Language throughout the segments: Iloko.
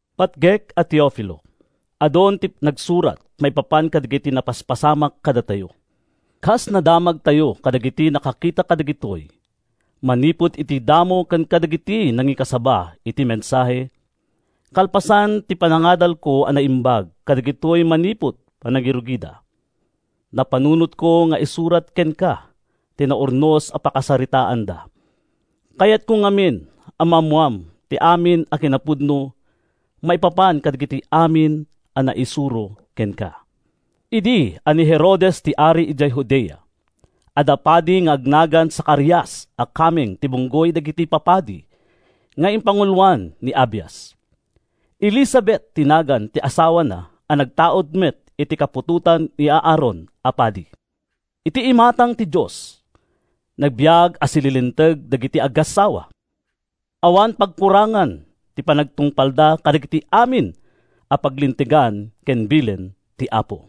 Patgek a Teofilo, Adun ti nagsurat maipapan kadagiti napaspasamak kadatayo, kas nadamagtayo kadagidi nakakita kadagitoy manipud idi damo ken kadagidi nangikasaba iti mensahe. Kalpasan ti panangadalko a naimbag kadagitoy manipud panangrugida, napanunotko nga isurat kenka ti naurnos a pakasaritaanda. Kayatko ngamin a maammoam ti amin a kinapudno maipapan kadagiti amin a naisuro kenka. Idi a ni Herodes ti ari idiay Judea, adda padi nga agnagan Zacarias a kameng ti bunggoy dagiti papadi nga ipanguloan ni Abias. Elisabet ti nagan ti asawana a nagtaud met iti kaputotan ni Aaron a padi. Iti imatang ti Dios, nagbiag a sililinteg dagiti agassawa. Awan pagkurangan ti panagtungpalda kadagiti amin a paglintegan ken bilin ti Apo.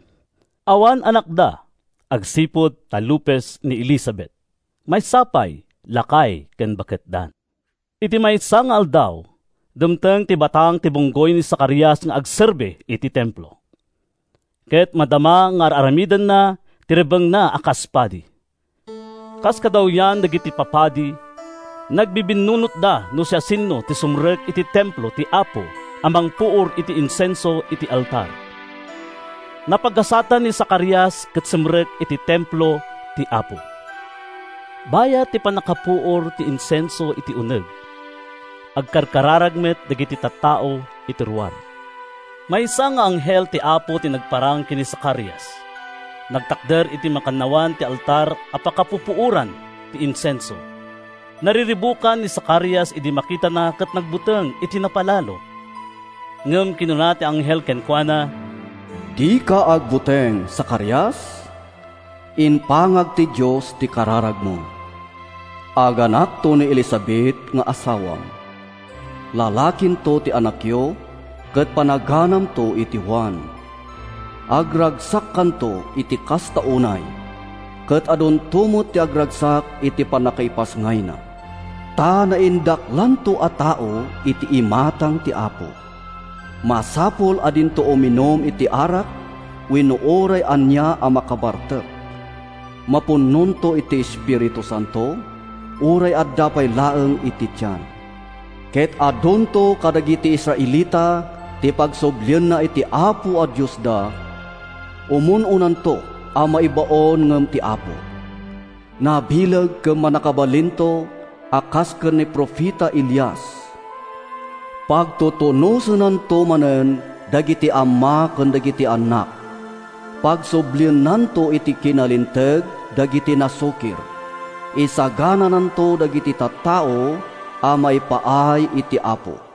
Awan anakda agsipud ta lupes ni Elisabet. Maysa pay, lakay ken baketdan. Iti maysa nga aldaw, dimteng ti batang ti bunggoy ni Zacarias nga agserbi iti Templo, ket madama nga ar-aramidenna ti rebbengna a kas padi. Kas kadawyan dagiti papadi, nagbibinnunotda no siasino ti sumrek iti Templo ti Apo a mangpuor iti insenso iti altar. Napagasatan ni Zacarias ket simrek iti Templo ti Apo. Bayat ti pannakapuor ti insenso iti uneg, agkarkararag met dagiti tattao iti ruar. Maysa nga anghel ti Apo ti nagparang ken ni Zacarias. Nagtakder iti makannawan ti altar a pakapupuoran ti insenso. Nariribukan ni Zacarias idi makitana ket nagbuteng iti napalalo. Ngem kinuna ti anghel kenkuana, “Dika agbuteng, Zacarias! Impangag ti Dios ti kararagmo. Aganakto ni Elisabet nga asawam. Lalakinto ti anakyo ket panaganamto iti Juan. Agragsakkanto iti kasta unay, ket adunto met ti agragsak iti pannakaipasngayna. Ta naindaklanto a tao iti imatang ti Apo. Masapul a dinto uminum iti arak wenno uray ania a makabartek. Mapnonto iti Espiritu Santo uray adda pay laeng iti tian ket adunto kadagiti Israelita ti pagsublienna iti Apo a Diosda. Umun-unanto a maibaon ngem ti Apo. Nabileg ken mannakabalinto a kas ken ni profeta Elias. Pagtutunosennanto manen dagiti amma ken dagiti annak. Pagsubliennanto iti kinalinteg dagiti nasukir. Isaganananto dagiti tattao a maipaay iti Apo.”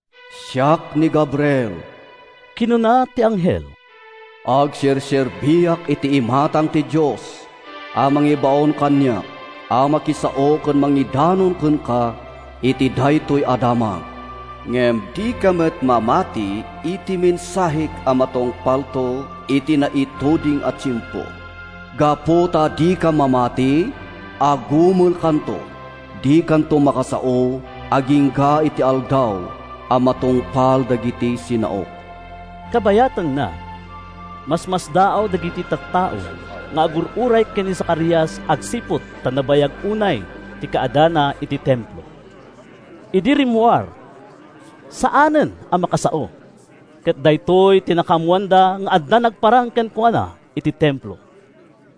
“Siak ni Gabriel,” kinuna ti anghel. “Agserserbiak iti imatang ti Dios a nangibaon kaniak a makisao ken mangidanon kenka iti daytoy a damag. Ngem dika met mamati iti mensahek a matungpalto iti naituding a tiempo. Gapu ta dika mamati, agumelkanto ket dikanto makasao agingga iti aldaw a matungpal dagiti sinaok.” Kabayatanna, masmasdaaw dagiti tattao nga agur-uray ken ni Zacarias agsipud ta nabayag unay ti kaaddana iti Templo. Idi rummuar, saanen a makasao, ket daytoy ti nakaammoanda nga adda nagparang kenkuana iti Templo.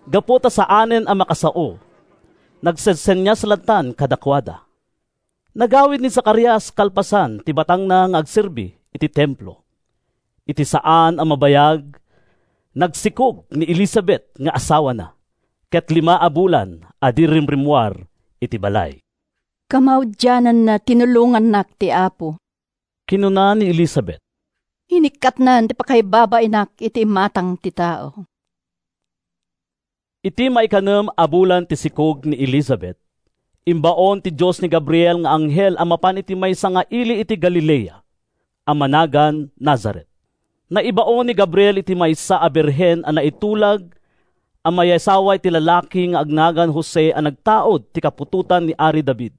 Gapu ta saanen a makasao, nagsensenias lattan kadakuada. Nagawid ni Zacarias kalpasan ti batangna nga agserbi iti Templo. Iti saan a mabayag, nagsikog ni Elisabet nga asawana, ket lima a bulan a di rimrimmuar iti balay. “Kamaudianna, tinulongannak ti Apo,” kinuna ni Elisabet. “Inikkatnan ti pakaibabainak iti imatang ti tao.” Iti maikanem a bulan ti sikog ni Elisabet, imbaon ti Dios ni Gabriel nga anghel a mapan iti maysa nga ili ti Galilea, a managan Nazaret. Naibaon ni Gabriel iti maysa a birhen a naitulag a mayasawa iti lalaki nga agnagan Jose a nagtaud iti kaputotan ni ari David.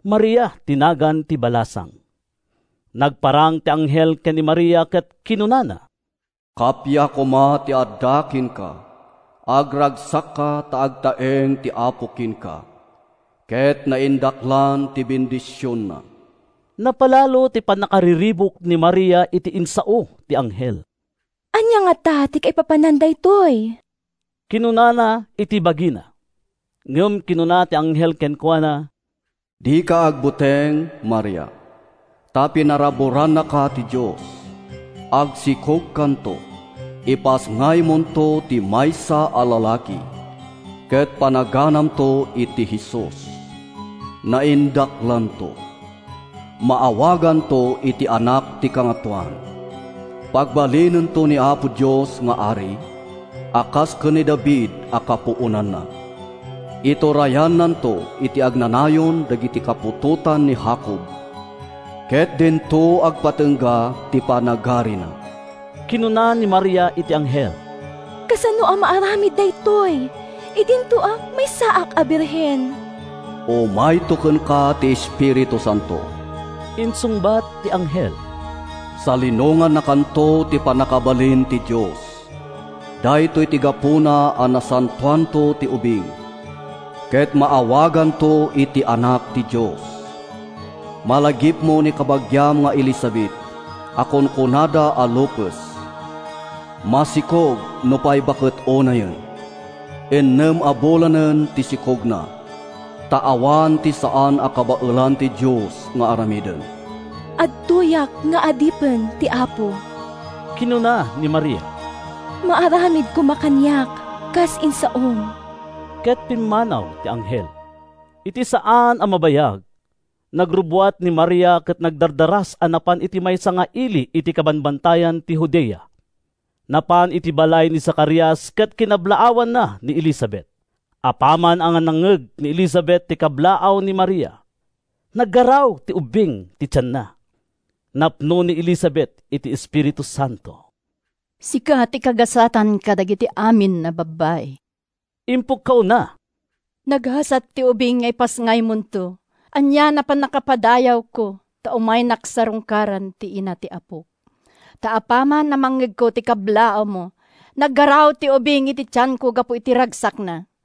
Maria ti nagan ti balasang. Nagparang ti anghel ken ni Maria ket kinunana, “Kappia koma ti adda kenka. Agragsakka ta agtaeng ti Apo kenka ket naindaklan ti bendisionna.” Napalalo ti pannakariribuk ni Maria iti insao ti anghel. “Ania ngata ti kaipapanan daytoy?” kinunana iti bagina. Ngem kinuna ti anghel kenkuana: “Dika agbuteng, Maria, ta pinaraburannaka ti Dios. Agsikogkanto. Ipasngaymonto ti maysa a lalaki, ket panaganamto iti Jesus. Naindaklanto. Maawaganto iti Anak ti Kangatoan. Pagbalinento ni Apo Dios nga ari, a kas ken ni David a kapuonanna. Iturayannanto iti agnanayon dagiti kaputotan ni Jacob, ket dinto agpatingga ti panagarina.” Kinuna ni Maria iti anghel: “Kasano a maaramid daytoy idinto a maysaak a birhen?” “Umayto kenka ti Espiritu Santo,” insungbat ti anghel. “Salinongannakanto ti pannakabalin ti Dios. Daytoy ti gapuna a nasantoanto ti ubing, ket maawaganto iti Anak ti Dios. Malagipmo ni kabagiam nga Elisabet a kunkunada a lupes? Masikog nupay baket unayen. Innem a bulanen ti sikogna. Ta awan ti saan a kabaelan ti Dios nga aramiden.” “Adtoyak nga adipen ti Apo,” kinuna ni Maria. “Maaramid koma kaniak, kas insaom.” Ket pimmanaw ti anghel. Iti saan a mabayag, nagrubbuat ni Maria ket nagdardaras a napan iti maysa nga ili iti kabambantayan ti Judea. Napan iti balay ni Zacarias ket kinablaawanna ni Elisabet. Apaman a nangngeg ni Elisabet ti kablaaw ni Maria, naggaraw ti ubing iti tianna. Napno ni Elisabet iti Espiritu Santo. “Sika ti kagasatan kadagiti amin a babbai!” impukkawna. “Nagasat ti ubing nga ipasngaymonto. Anian a pannakapadayawko, ta umaynak sarungkaran ti ina ti Apok! Ta apaman a nangngegko ti kablaawmo, naggaraw ti ubing iti tianko gapu iti ragsakna.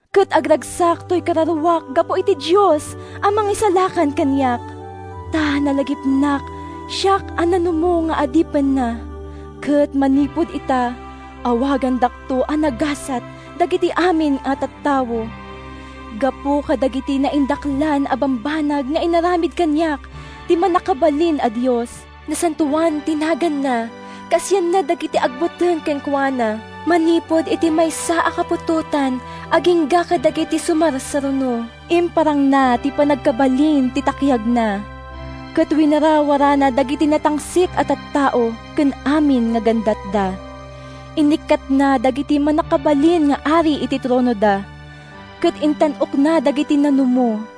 Ket agragsak toy kararuak gapu iti Dios a Mangisalakan kaniak. Ta nalagipnak, siak a nanumo nga adipenna, Ket manipud ita, awagandakto a nagasat dagiti amin a tattao, Gapu kadagiti naindaklan a bambanag nga inaramid kaniak ti Mannakabalin a Dios. Nasantoan ti naganna; Kaasianna dagiti agbuteng kenkuana, Manipud iti maysa a kaputotan agingga kadagiti sumarsaruno. Imparangna ti pannakabalin ti takkiagna, Ket winarawarana dagiti natangsit a tattao ken amin a gandatda. Inikkatna dagiti mannakabalin nga ari iti tronoda, Ket intan-okna dagiti nanumo.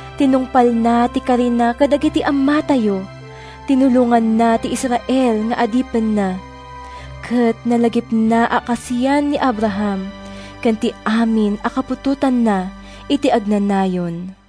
Tinungpalna ti karina kadagiti ammatayo; Tinulonganna ti Israel nga adipenna, Ket nalagipna a kaasian ni Abraham, Ken ti amin a kaputotanna iti agnanayon.”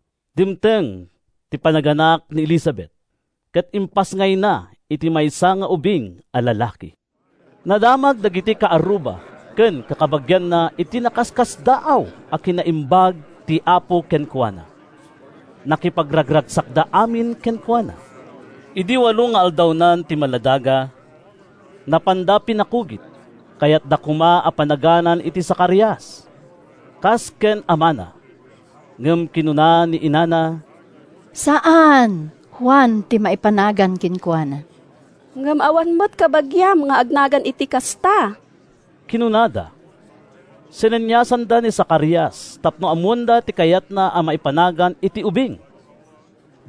Dimteng ti panaganak ni Elisabet, ket impasngayna ti maysa nga ubing a lalaki. Nadamag dagiti kaarruba ken kakabagianna ti nakaskasdaaw a kinaimbag ti Apo kenkuana. Nakipagragsakda amin kenkuana. Idi walo nga aldawnan ti maladaga, napanda pinakugit. Kayatda koma a panaganan iti Zacarias, kas ken ni amana. Ngem kinuna ni inana: “Saan! Juan ti maipanagan kenkuana.” “Ngem awan met kabagiam nga agnagan iti kasta,” kinunada. Sineniasanda ni Zacarias tapno ammoenda ti kayatna a maipanagan iti ubing.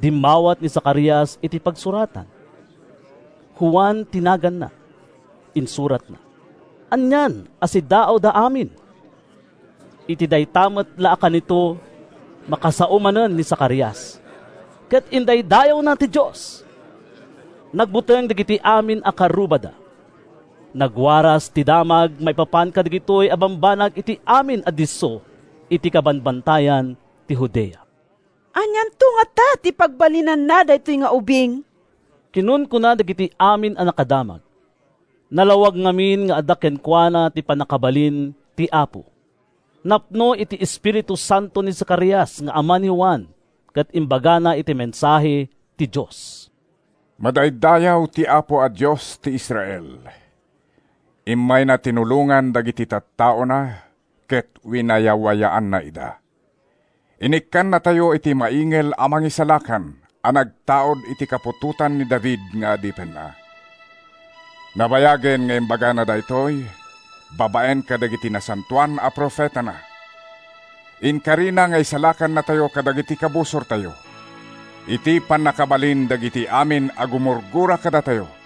Dimmawat ni Zacarias iti pagsuratan. “Juan ti naganna,” insuratna. Anian a siddaawda amin! Iti dayta met la a kanito, makasao manen ni Zacarias, ket indaydayawna ti Dios. Nagbuteng dagiti amin a kaarrubada. Nagwaras ti damag maipapan kadagitoy a bambanag iti amin a disso iti kabambantayan ti Judea. “Anianto ngata ti pagbalinan daytoy nga ubing?” kinunkuna dagiti amin a nakadamag. Nalawag ngamin nga adda kenkuana ti pannakabalin ti Apo. Napno iti Espiritu Santo ni Zacarias nga ama ni Juan ket imbagana ti mensahe ti Dios: “Madaydayaw ti Apo a Dios ti Israel! Immayna tinulongan dagiti tattaona ket winayawayaanna ida. Inikkannatayo iti maingel a Mangisalakan a nagtaud iti kaputotan ni David nga adipenna. Nabayagen nga imbagana daytoy, babaen kadagiti nasantoan a profetana. Inkarina nga isalakannatayo kadagiti kabusortayo, iti pannakabalin dagiti amin a gumurgura kadatayo;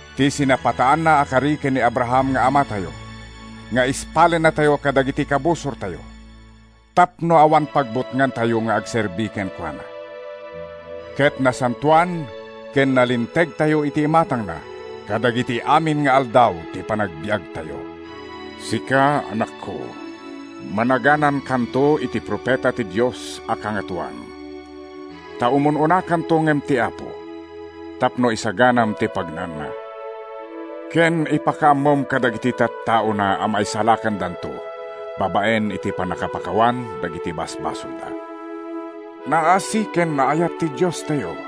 Ti sinapataanna a kari ken ni Abraham nga amatayo, Nga ispalennatayo kadagiti kabusortayo, Tapno awan pagbutngantayo nga agserbi kenkuana, Ket nasantoan ken nalintegtayo iti imatangna kadagiti amin nga aldaw ti panagbiagtayo. “Sika, anakko, managanankanto iti profeta ti Dios a Kangatoan. Ta umun-unakanto ngem ti Apo, Tapno isaganam ti pagnaanna, Ken ipakaammom kadagiti tattaona a maisalakandanto, Babaen iti pannakapakawan dagiti basbasolda. Naasi ken naayat ti Diostayo;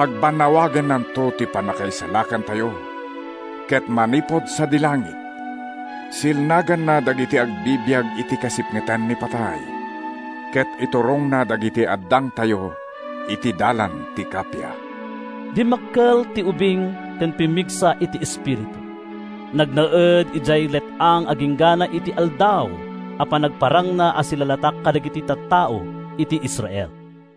Pagbannawagennanto ti pannakaisalakantayo, Ket manipud sadi langit, silnaganna dagiti agbibiag iti kasipngetan ni patay, Ket iturongna dagiti addangtayo iti dalan ti kappia.” Dimmakkel ti ubing ken pimmigsa iti espiritu. Nagnaed idiay let-ang agingga iti aldaw a panagparangna a silalatak kadagiti tattao iti Israel.